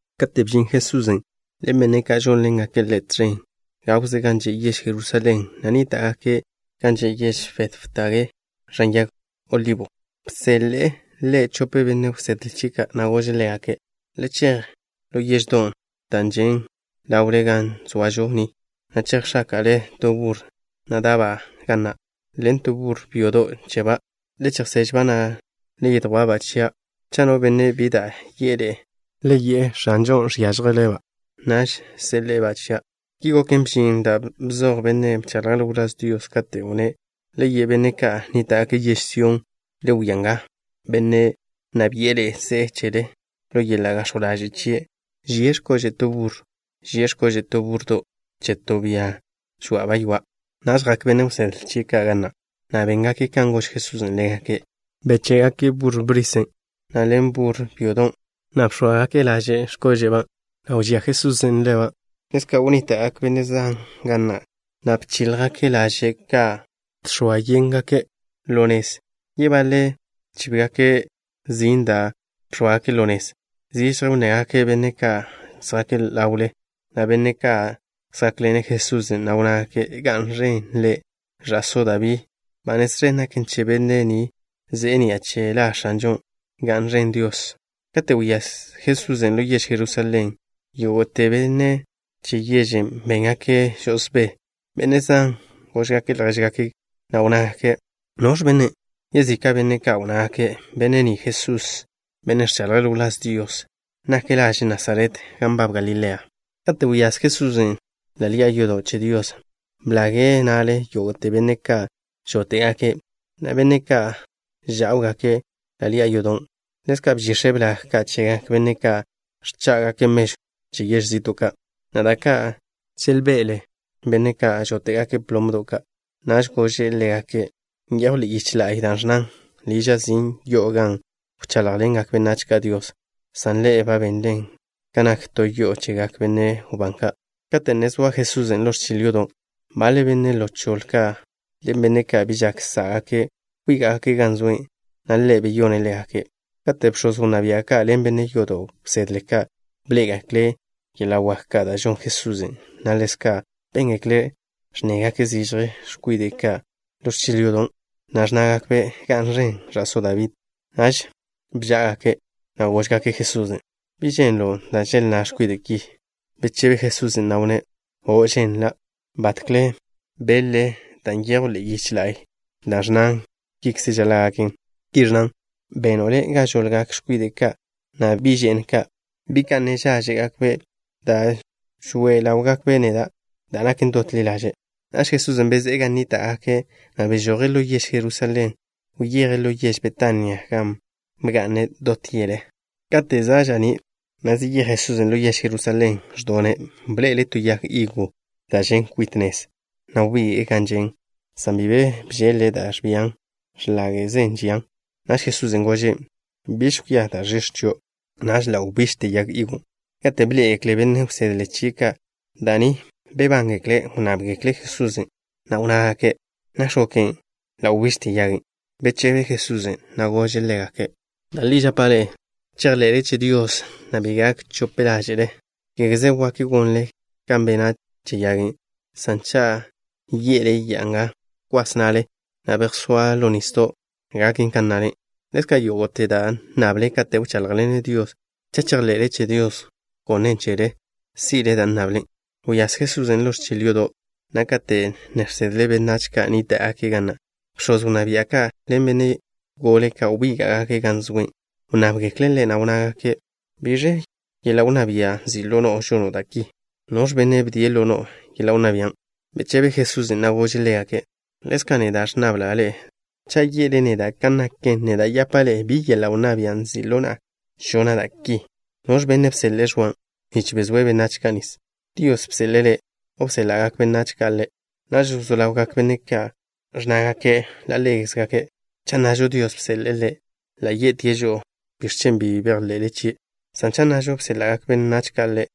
Kate' bžin Jesusen' ḻen benne' ka' žónḻengake' Ḻe' tẕen gawze gan že' yež Jerusalén, na' nníta'gake' gan že' yež Betfagé ẕan Ya'a Yag Olibo, bseḻe'e Ḻe' chope benne' wsedle chie' ka', na' gože' ḻégake': —Le chej ḻo yeždon' da' žen' ḻawle ga zoažo ni, na' chejx̱áka'le to burro wná' da'ba' ga na', ḻen to burro byodo' cheba'. Le chejseže-ba', na' le yedjwá'-ba' chia'. Cha' no benne' bi da' yi'e ḻe'e, le ye'e: “X̱anžon' žénele'-ba'.” Naž seḻe'e-ba' chia'. Ki goken, bžin da' bzoj bennen' bchaḻje' ḻo wláz Dios, katen' wnné': Le ye' benne' ka' nníta'gake' yež Sión: “Le wia nga, Benne' nna bi'e ḻe'e ze'e chele. Ḻo yeḻa' gax̱jw ḻaže' chie' ži'e x̱kože' to burro. Ži'e x̱kože' to búrrodo' che to bia žwa'ba' ywa'.” Naž jak benne' wsedle chie' ka' ga na', na' béngake' kan gož Jesusen' ḻégake'. Beché'gake' burro wná' na' ḻen burro byodon', na' bx̱óagake' laže' yicha' chégake' ka' x̱kóže'ba', na' wžé' Jesusen' ḻaw laže' ka'. Ḻezka' wnníta'gak benne' zan ga na', na' bchíljgake' laže' ka' žx̱oa yéngake' ḻo nez. Yebaḻe' bchíbgake' zin da' bx̱óagake' ḻo nez. Zižje wnnegak benne' ka' zjake' ḻawle, na' benne' ka' zjákḻene' Jesusen', na' wnnágake': —¡Ga'n ẕen Ḻe', ẕa'só Dabí! ¡Ba nez ẕen naken che benne' ni ze'e ni'a che La X̱anžo! ¡Ga'n ẕen Dios! Kate' wyáz Jesusen' ḻo yež Jerusalén, yógo'te benne' che yežen' béngake' žo'osbé. Benne' zan góžgake' ljéžgake' ka', na' wnnágake': —¿Noẕ bennen'? Yezika' benne' ka' wnnágake': —Benne' ni Jesús, bennen' ẕchaḻje' ḻo wláz Dios. Nak laže' Nasaret gan nbab Galilea. Kate' wyáz Jesusen' ḻo ḻi'a yodo' che Dios, blage' na'le yógo'te benne' ka' žóte'gake' na' benne' ka' žá'wgake' ḻo ḻi'a yodon'. Ḻezka' bžix̱e' blag ka' chegak benne' ka' ẕchá'gake' mežw che yež zi'to' ka', na' da' ka' želbe'le benne' ka' žóte'gake' plomdo' ka'. Naž gože' ḻégake': —Nyejw ḻe'e yiche la'y da' ẕnnan: “Liža' sin' yo'o gan wcháḻjḻengak benách ka' Dios” san ḻe'e ba benlen kan nak to yo'o chegak benne' wbán ka'. Kate' ne zoa Jesusen' ḻo ẕchil yodo', baḻe benne' ḻo choḻe ka' ḻen benne' ka' bi žak sá'gake', wbíga'gake' gan zoe', na' Ḻe' beyone' ḻégake'. Kate' bx̱oz wnná bia' ka' ḻen benne' yodo' wsedle ka', bḻé'egekle' yeḻa' wak ka' da' žon Jesusen', na' ḻezka' béngekle' ẕnnegak zižje x̱kwide' ka' ḻo ẕchil yodo', na' ẕnnágakbe': “¡Ga'n ẕen ẕa'só Dabí!” naž bžá'agake', na' góžgake' Jesusen': —¿Bi ženlo' da' želnná x̱kwide' ki? Bechebe Jesusen', na' wnné': —O', ženlan'. ¿Batkle beḻ-le da' nyejw ḻe'e yiche la'y da' ẕnnan kikze žaḻa' gaken? Ki ẕnnan: “Beno' Le' ga žoḻgak x̱kwide' ka', na' bi' že'n ka', bi' ka' ne žáẕe'gakbe', da' žoe ḻáwgakbe' neda' da' naken dot ḻi ḻaže'.” Naž Jesusen' bezé'e gan nníta'gake', na' bežoje' ḻo yež Jerusalén. Wyeje' ḻo yež Betania gan bga'ne' dot yele. Kate' za' ža'ní', na' zeyéj Jesusen' ḻo yež Jerusalén, ẕdone'. Bḻe'ele' to yag higo da' žen' kwit nez, na' wbige'e gan žen', san bi be bžeḻ-le' da' ẕbian. X̱láge'ze žian. Naž Jesusen' gožen': —Biž kwia da' ẕix̱ chio'. Naž ḻa' wbižte yag higon'. Kate' bḻé'egekle benne' wsedle chie' ka' da' ni, bebángekle'. Wnnábgekle' Jesusen', na' wnnágake': —¿Nakx̱ goken, ḻa' wbižte yagen'? Bechebe Jesusen', na' gože' ḻégake': —Da' li žapa' ḻe'e, cha' chejḻe'le che Dios, na' bi gak chope ḻáže'le, kégeze wak gonle kan bena' che yagen', san cha' ye'le ya'a nga: “Bkwas na'le, na' bejsóa ḻo nisdo'” gaken kan nnale. Ḻezka', yógo'te da' nnable kate' wcháḻjḻenle Dios, cha' chejḻe'le che Dios gonen' chele, si'le dan' nnable. Wyáz Jesusen' ḻo ẕchil yodo', na' kate' ne žsedle' benách ka' nníta'gake' ga na', bx̱oz wnná bia' ka' ḻen benne' gole ka', wbíga'gake' gan zoe'. Wnnábgekle' Ḻe', na' wnnágake': —¿Biẕ yeḻa' wnná bia' nzi' ḻo no'o, žono' da' ki? ¿Noẕ benne' bdie' ḻo no'o yeḻa' wnná bian'? Bechebe Jesusen', na' gože' ḻégake': —Ḻezka' neda' nnabla' ḻe'e to. Cha' ye'le neda' kan naken, neda' yapa' ḻe'e bi yeḻa' wnná bia' nzi' ḻo na'a žona' da' ki. ¿Noẕ benne' bseḻe'e Ẕwan' nich bezóe' benách ka' nis? ¿Dios bseḻe'e ḻe', o bséḻa'gak benne' ka' ḻe'? Naž wzó ḻawgak benne' yodo' ka' ẕnnágake' ḻa' ḻégakze': —Cha' nnažo: Dios bseḻe'e ḻe', ḻa' ye'tie' žo'o: “¿Biẕ chen' bi bejḻe'le chie'?” San cha' nnažo: bséḻa'gak benne' ka' ḻe',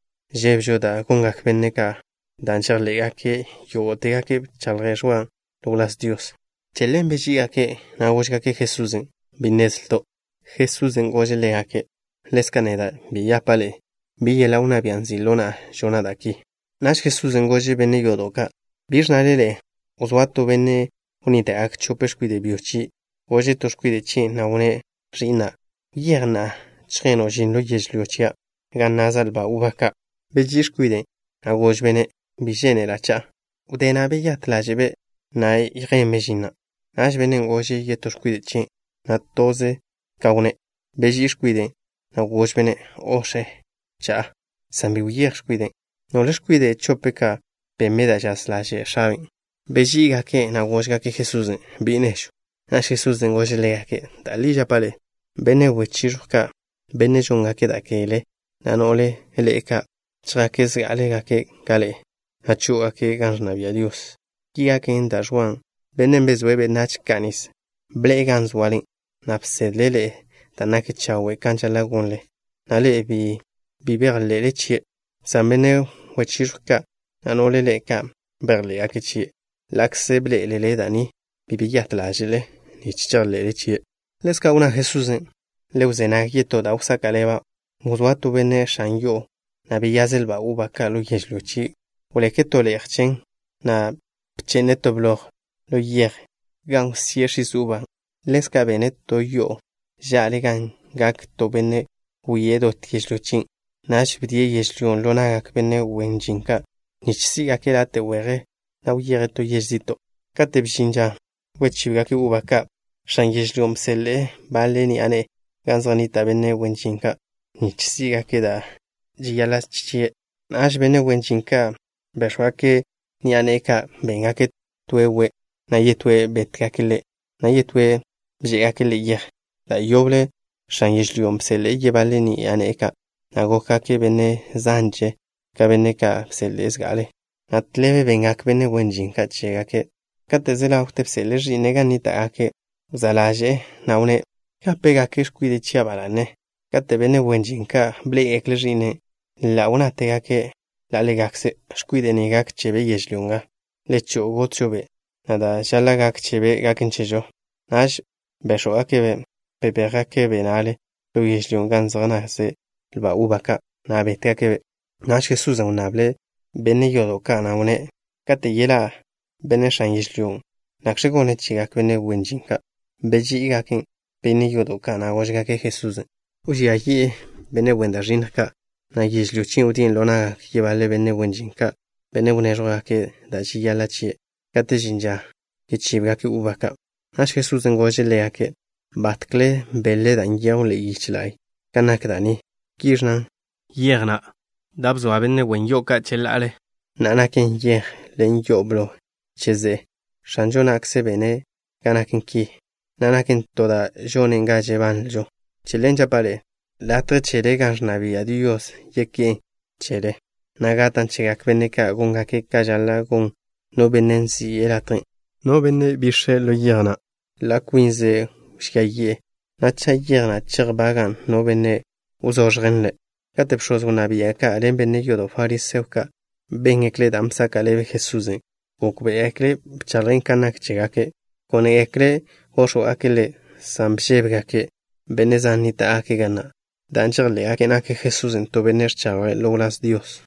žébežo da' gongak benne' wláž ka', dan' žejḻé'gake' yógo'tegake' bchaḻj Ẕwan' ḻo wláz Dios. Che ḻen beží'igake', na' góžgake' Jesusen': —Bi nnezlto'. Jesusen' gože' ḻégake': —Ḻezka' neda' bi yapa' ḻe'e bi yeḻa' wnná bia' nzi' ḻo na'a žona' da' ki. Naž Jesusen' gože' benne' yodo' ka': —¿Biẕ nnale ḻe'e? Wzóa to benne' wnníta'gak chope x̱kwide' byo chie'. Gože' to x̱kwide' chien', na' wnné': “Ẕi'na', wyéj na'a chjeno' žin ḻo yežlyó chia' gan naza' lba uba ka'.” Beží'i x̱kwiden', na' gožbe'-ne': “Bi žénela' cha'a.” Wdé na' beyát ḻáže'be', na' yjenbe' žin na'. Naž bennen' gože' yetó x̱kwide' chien', na' toze kan wnné'. Beží'i x̱kwiden', na' gožbe'-ne': “O', x̱e. Cha'a.” San bi wyéj x̱kwiden'. ¿Nole x̱kwide' chope ka' benbe' da' žaz ḻaže' x̱abe'? Beží'igake', na' góžgake' Jesusen': —Bi' nežw. Naž Jesusen' gože' ḻégake': —Da' li žapa' ḻe'e: benne' wechiẕjw ka', benne' žóngake' da' kegle, na' no'le ḻe'e ka', chjake' zgá'alegake' ka ḻe'e, na' chó'ogake' gan ẕnna bia' Dios. Ki gaken dan' Ẕwa, bennen' bezóe' benách ka' nis, bḻe'e gan zoale, na' bsedle' ḻe'e da' naken chawe' kan žaḻa' gonle, na' ḻe'e bi bejḻe'le chie', san benne' wechiẕjw ka' na' no'le ḻe'e ka', bejḻé'gake' chie'. Ḻa'kze bḻé'elele da' ni, bi beyát ḻáže'le nich chejḻe'le chie'. Ḻezka' wnná Jesusen': —Le wzé nag yetó da' wsaka' ḻeba'. Wzóa to benne' x̱an yo'o, na' beyaze' lba uba ka' ḻo yežlyó chie'. Wbeke' to le'je chen, na' bche'ne' to bloj ḻo yej gan wsíe' x̱is uba ka'. Ḻezka' bene' to yo'o ža'le gan gak to benne' wie' dot yežlyó chien'. Naž bdie' yežlyón' ḻo na'gak benne' wen žin ka', nich sí'gake' late' weje, na' wyeje' to yež zi'to'. ’Kate' bžin ža wchíbgake' uba ka', x̱an yežlyón' bseḻe'e baḻe ni'a ne'e gan zej nnita' benne' wen žin ka' nich sí'gake' da' žeyaḻa' chie'. Naž benne' wen žin ka' béx̱wgake' ni'a ne'e ka'. Béngake' toe' we', na' yetóe' bétgake' ḻe', na' yetóe' bžé'egake' ḻe' yej. Da' yoble x̱an yežlyón' bseḻe'e yebaḻe ni'a ne'e ka', na' gókgake' benne' zanže ka benne' ka' bseḻe'e zga'ale, na' tḻebe bengak benne' wen žin ka' chégake'. ’Kate' ze ḻawte, bseḻe'e ẕi'ne' gan nníta'gake'. Wzá' ḻaže'e, na' wnné': “Gápegake' x̱kwide' chia' ba la'ne.” Kate' benne' wen žin ka' bḻé'egekle' ẕi'ne' na', ḻa' wnnátegake' ḻa' ḻégakze': “X̱kwide' ni gak chebe' yežlyó nga. Le cho'o, gotžo-be', na' da' žaḻa' gak chebe' gaken chežo.” Naž béx̱wgake'-be'. Bebéjgake'-be' na'le ḻo yežlyón' gan zej naz lba uba ka', na' bétgake'-be'. Naž Jesusen' wnnable' benne' yodo' ka', na' wnné': —Kate' yeḻá' benne' x̱an yežlyón', ¿nakx̱ gone' chegak benne' wen žin ka'? Beži'igak benne' yodo' ka', na' góžgake' Jesusen': —Wžía yi'e benne' wen da' ẕinnj ka', na' yežlyó chien' wdíe' ḻo na'gak yebaḻe benne' wen žin ka', benne' wnéẕjwgake' da' žeyaḻa' chie' kate' žin ža chíbgake' uba ka'. Naž Jesusen' gože' ḻégake': —¿Batkle beḻ-le dan' nyejw ḻe'e yiche la'y kan nak da' ni? Ki ẕnnan: Yej na' da' bzoa cheḻa'ale benne' wen yo'o ka', na'a naken yej ḻen yo'o blo che ze'e. X̱anžo na'kze bene' ga naken ki, na' naken to da' žonen ga žebanlžo. Che ḻen žapa' ḻe'e, latje chele gan ẕnna bia' Dios yeké'n chele, na' gatan' chegak benne' ka' góngake' kan žaḻa' gon no benne' nzi'e latjen'. No benne' wtope' ḻo yej na', ḻa' kwinze' wžía yi'e, na' cha' yej na' chejbagan' no benne', wzoẕjen ḻe'. Kate' bx̱oz wnná bia' ka' ḻen benne' yodo' fariseo ka' béngekle' dan' bsaka' ḻebe Jesusen', gókbe'egekle' bchaḻje' kan nak chégake'. Gónegekle' góx̱wgake' Ḻe', san bžébegake' benne' zan nníta'gake' ga na', dan' žejḻé'gake' nak Jesusen' to benne' ẕchaḻje' ḻo wláz Dios.